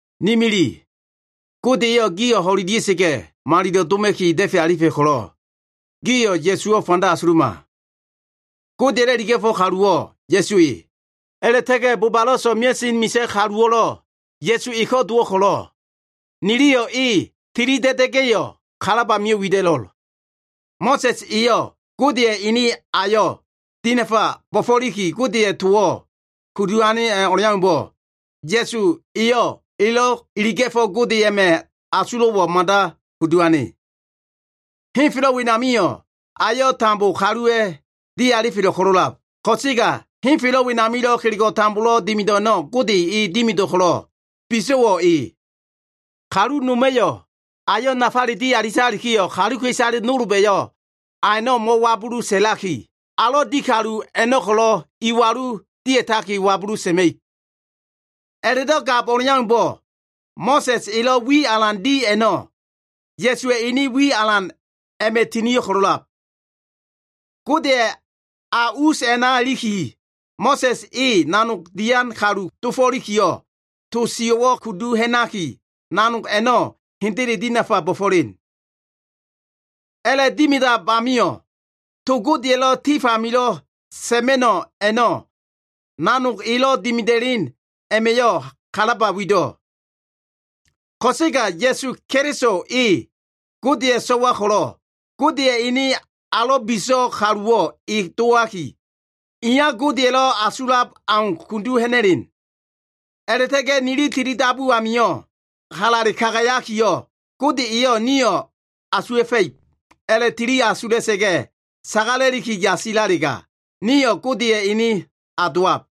Ni mili, Gode eyo꞉ gio꞉ ho꞉ida꞉sa꞉ga꞉ malilo꞉ doma꞉ki da꞉fe alifa꞉ ko꞉lo꞉, gio꞉ Ya꞉suwo꞉ fanda asuluma. Godeya꞉lo꞉ iliga꞉fo꞉ kaluwo꞉ Ya꞉su e, a꞉la꞉ta꞉ga꞉ bobalo꞉ so꞉mea꞉sen misa꞉ kaluwo꞉lo꞉ Ya꞉su eko꞉ dowo꞉ ko꞉lo꞉, niliyo꞉ e tilida꞉da꞉ga꞉yo꞉, kalab amio꞉ wida꞉lo꞉l. Mo꞉sa꞉s eyo꞉ Godeya꞉ ene ayo꞉ dinafa bo꞉fo꞉likilo꞉ Godeya꞉ towo꞉ kudu ane o꞉leaumbo꞉, Ya꞉su eyo꞉ elo꞉ iliga꞉fo꞉ Gode a꞉ma꞉ asulo꞉wo꞉ mada kudu ane. Henfelo꞉ wenamio꞉ ayo꞉ tambo kaluwa꞉ dialifelo꞉ ko꞉lo꞉lab. Ko꞉sega henfelo꞉ wenamilo꞉ kelego꞉ tambolo꞉ dimido꞉ a꞉no꞉ Gode e dimido꞉ ko꞉lo꞉, biso꞉wo꞉ e. Kalu noma꞉yo꞉ ayo꞉ nafale dialitalikiyo꞉, kaluka꞉isale nolba꞉yo꞉ a a꞉no꞉ mo꞉wabulu sa꞉laki, alo꞉ di kalu a꞉no꞉ ko꞉lo꞉ iwalu dia꞉taki wabulu sa꞉ma꞉ib. A꞉la꞉do꞉ gab o꞉leaumbo꞉, Mo꞉sa꞉s elo꞉ wi alan di a꞉no꞉, Ya꞉suwa꞉ ene wi alan a꞉ma꞉ tinio꞉ ko꞉lo꞉lab. Godeya꞉ a us a꞉na iliki, Mo꞉sa꞉s e nanog dian kalu dofo꞉likiyo꞉, to sio꞉wo꞉ kudu ha꞉naki nanog a꞉no꞉ hendele dinafa bo꞉fo꞉len. A꞉la꞉dimidab amio꞉, to Godeya꞉lo꞉ tif amilo꞉ sa꞉ma꞉no꞉ a꞉no꞉ nanog elo꞉ dimida꞉len a꞉ma꞉yo꞉ kalaba wido꞉. Ko꞉sega Ya꞉su Keliso e, Godeya꞉ so꞉wa ko꞉lo꞉, Godeya꞉ ene alo꞉ biso꞉ kaluwo꞉ e dowaki, iya Godeya꞉lo꞉ asulab au kudu ha꞉na꞉len. A꞉la꞉ta꞉ga꞉ nili tilidabu a꞉namio꞉ halale kagayakiyo꞉, Gode eyo꞉ nio꞉ asuwa꞉fa꞉ib a꞉la꞉tili asula꞉sa꞉ga꞉ sagala꞉liki yasisalega, nio꞉ Godeya꞉ ene a dowab.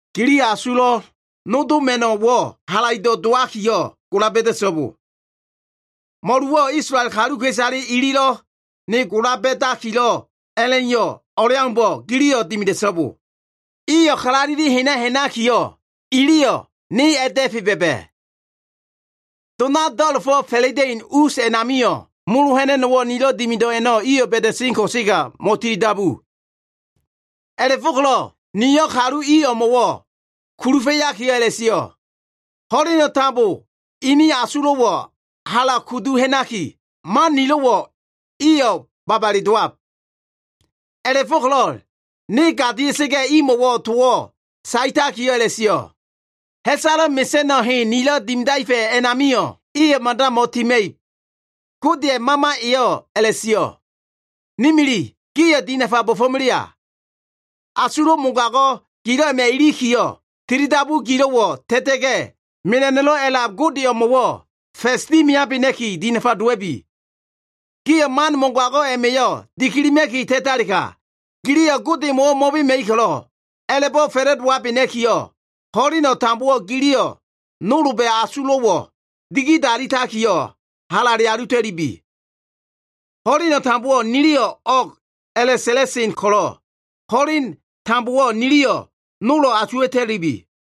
gili asulo꞉ nodoma꞉no꞉wo꞉ halaido꞉ dowakiyo꞉, gola ba꞉da꞉so꞉bo! Mo꞉luwo꞉ Isolael kaluka꞉isale ililo꞉ ne gola ba꞉dakilo꞉ a꞉la꞉iyo꞉ o꞉leaumbo꞉, giliyo꞉ dimida꞉so꞉bo. Iyo꞉ kalaleli hena ha꞉nakiyo꞉, iliyo꞉ ne a꞉da꞉fe ba꞉ba꞉. Dona do꞉la꞉fo꞉ fa꞉la꞉da꞉in us a꞉namio꞉ molo ha꞉na꞉no꞉wo꞉ nilo꞉ dimido꞉ a꞉no꞉ iyo꞉ ba꞉da꞉sen ko꞉sega mo꞉tilidabu. A꞉la꞉fo꞉ko꞉lo꞉ niyo꞉ kalu i o꞉mo꞉wo꞉ kulufa꞉yakiyo꞉ a꞉la꞉sio꞉, ‘Ho꞉leno꞉ tambo ini asulo꞉wo꞉ hala kudu ha꞉naki, man nilo꞉wo꞉ iyo꞉ babale dowab.’ A꞉la꞉fo꞉ko꞉lo꞉ ne gadia꞉sa꞉ga꞉ imo꞉wo꞉ towo꞉ saetakiyo꞉ a꞉la꞉sio꞉, ‘Ha꞉salo꞉ mesa꞉no꞉ hen nilo꞉ dimidaefa꞉ a꞉namio꞉, iyo꞉ mada mo꞉tima꞉ib.’” Godeya꞉ Mama eyo꞉ a꞉la꞉sio꞉. Ne mili, gio꞉ dinafa bo꞉fo꞉melea! Asulo꞉ mogago꞉ gilo꞉ a꞉ma꞉ ilikiyo꞉, tilidabu gilo꞉wo꞉ ta꞉ta꞉ga꞉, mela꞉no꞉lo꞉ a꞉lab Gode o꞉mo꞉wo꞉ fa꞉s dimiabena꞉ki dinafa dowa꞉bi. Gio꞉ man mogago꞉ a꞉ma꞉yo꞉ dikilima꞉ki ta꞉talega, giliyo꞉ Godemo꞉wo꞉ mo꞉bema꞉ib ko꞉lo꞉, a꞉la꞉bo꞉ fa꞉la꞉dowabena꞉kiyo꞉, ho꞉leno꞉ tambowo꞉ giliyo꞉ nolba꞉ asulo꞉wo꞉ digidalitakiyo꞉ halale alita꞉lubi. Ho꞉leno꞉ tambowo꞉ niliyo꞉ “o꞉g” a꞉la꞉sa꞉la꞉sen ko꞉lo꞉, ho꞉leno꞉ tambowo꞉ niliyo꞉ nolo꞉ asuwa꞉ta꞉lubi.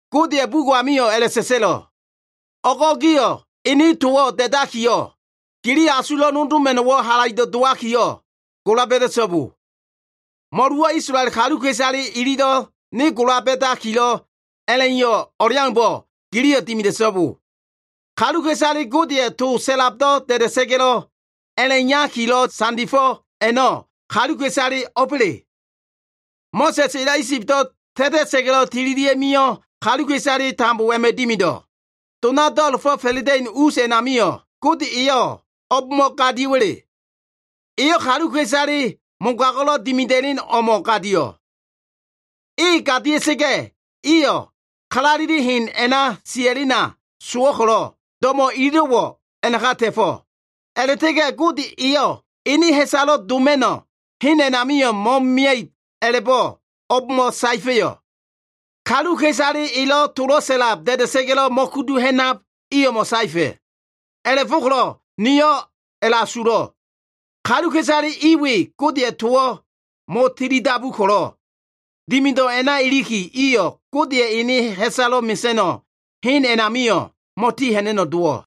Godeya꞉ bugo꞉ amio꞉ a꞉la꞉sa꞉sa꞉lo꞉, “O꞉go꞉ gio꞉ ene towo꞉ da꞉dakiyo꞉, gili asulo꞉ nodoma꞉no꞉wo꞉ halaido꞉ dowakiyo꞉, gola ba꞉da꞉so꞉bo! Mo꞉luwo꞉ Isolael kaluka꞉isale ililo꞉ ne gola ba꞉dakilo꞉ a꞉la꞉iyo꞉ o꞉leaumbo꞉, giliyo꞉ dimida꞉so꞉bo.” Kaluka꞉isale Godeya꞉ to sa꞉labo꞉ da꞉da꞉sa꞉ga꞉ a꞉la꞉iyakilo꞉ sandifo꞉ a꞉no꞉, kaluka꞉isale o꞉ba꞉le? Mo꞉sa꞉s elo꞉ Isibo꞉ ta꞉ta꞉ga꞉lo꞉ tililia꞉ mio꞉ kaluka꞉isale tambo a꞉ma꞉ dimido꞉. Dona do꞉la꞉fo꞉ fa꞉la꞉da꞉in us a꞉namio꞉ Gode eyo꞉, o꞉bmo꞉ gadio꞉wo꞉? Eyo꞉ kaluka꞉isale mogago꞉lo꞉ dimida꞉len o꞉mo꞉ gadio꞉. E gadia꞉sa꞉ga꞉, iyo꞉ kalaleli hen a꞉na sia꞉lena sowo꞉ ko꞉lo꞉, do꞉mo꞉ ililo꞉wo꞉ a꞉naka ta꞉fo꞉. A꞉la꞉ta꞉ga꞉ Gode eyo꞉ ene ha꞉salo꞉ doma꞉no꞉ hen a꞉namio꞉ mo꞉mia꞉ib a꞉labo꞉ o꞉bmo꞉ saefa꞉yo꞉? Kaluka꞉isale elo꞉ to sa꞉labo꞉ da꞉da꞉sa꞉ga꞉lo꞉ mo꞉kudu ha꞉nab i o꞉mo꞉ saefa꞉. A꞉la꞉fo꞉ko꞉lo꞉ nio꞉ a꞉la꞉asulo꞉. Kaluka꞉isale i we Godeya꞉ towo꞉ mo꞉tilidabu ko꞉lo꞉, dimido꞉ a꞉na ilikiyo꞉ iyo꞉ Godeya꞉ ene ha꞉salo꞉ mesa꞉no꞉ hen a꞉namio꞉ mo꞉tiha꞉na꞉no꞉ dowo꞉.